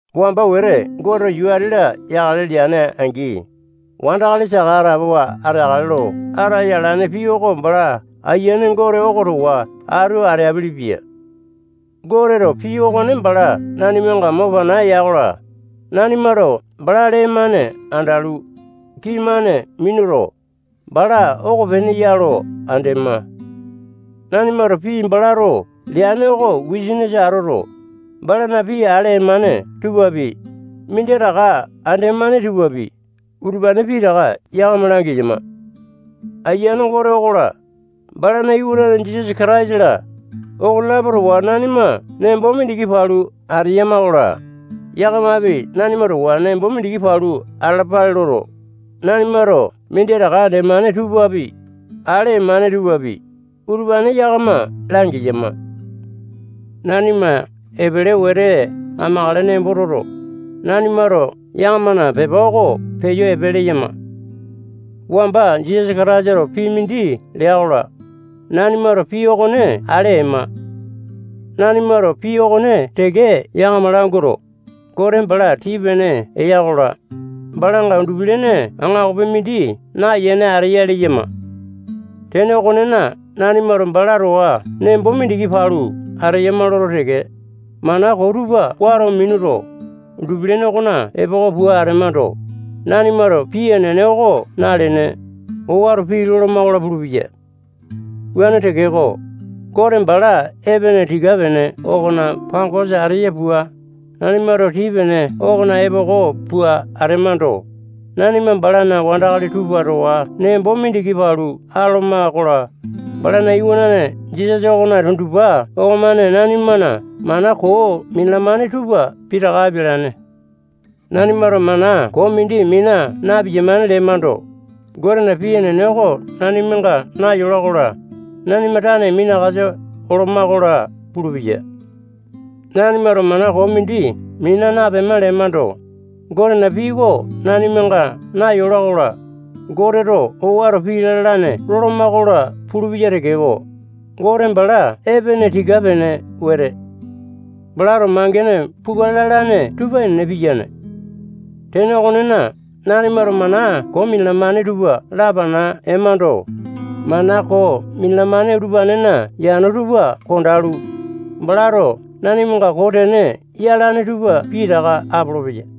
Wamba wete Goteto yuu ati-la yakale lene atea-angi, wandakali saka atapowa ateakale lo ataya alane pii oko bala Ayiane Gote oko towa atu ateapele-pia. Goteto pii okone bala nanimanga mo pana ya-kola, nanimato bala lee-mane andalu, kii-mane minuto, bala okopene ya lo andema. Nanimato pii balato leane oko wisanisa atoto, balana pii ale emane tupapi, minditaka andema tupapi, utupane pitaka yakama langeyama. Ayiane Gote okola, balana Iwanane Jisasa Kataisa-la, okonelapo towa nanima nembo mindiki palu ateyama-kola, yakamapi nanima towa nembo mindiki palu atalapale loto, nanimato minditaka andemane tupapi, ale emane tupapi, utupane yakama langeyama. Nanima epele wete amakale nembo toto, nanimato yakamana pepa oko peyo epe leyama. Wamba Jisasa Kataisato pii mindi lea-kola, nanimato pii okone ale ema. Nanimato pii okone teke yakama languato, Gote bala tii-pene eya-kola, balanga undupi-lene aŋakopi mindi nayene ateya leyama. Tene okonena, nanimato bala towa nembo mindiki palu ateyama loto teke, mana koo tupa wato minuto, undupi-lene okona epoko pua atemando, nanimato pii enene oko nalene, owato pii loloma-kola pulupeya. Wuane tekeko, Gote bala epene tii-pene okona pangosa ateya pua, nanimato tii-pene okona epoko pua atemando, nanima balana wandakali tupa towa nembo mindiki palu atoloma-kola, balana Iwanane Jisasa okona tundupa okomane nanimana mana koo minalamane tupa pitaka apialane. Nanimato mana koo mindi mina na-piyamane lemando, Gotena pii enene oko nanimanga nayola-kola, nanima tane minakasa oloma-kola pulupeya. Nanimato mana koo mindi mina napema lemando, Gotena pii oko nanimanga nayola-kola, Goteto owato pii lalane loloma-kola pulupeya tekeko, Gote bala epene tika-pene wete. Balato mangene pukale lalane tupa enene piyane. Tene okonena, nanimato mana koo minalamane tupa lapana emando, mana koo minalamane utupanena yano tupa kondalu, balato nanimanga koo tene yalane tupa pitaka apolopeya.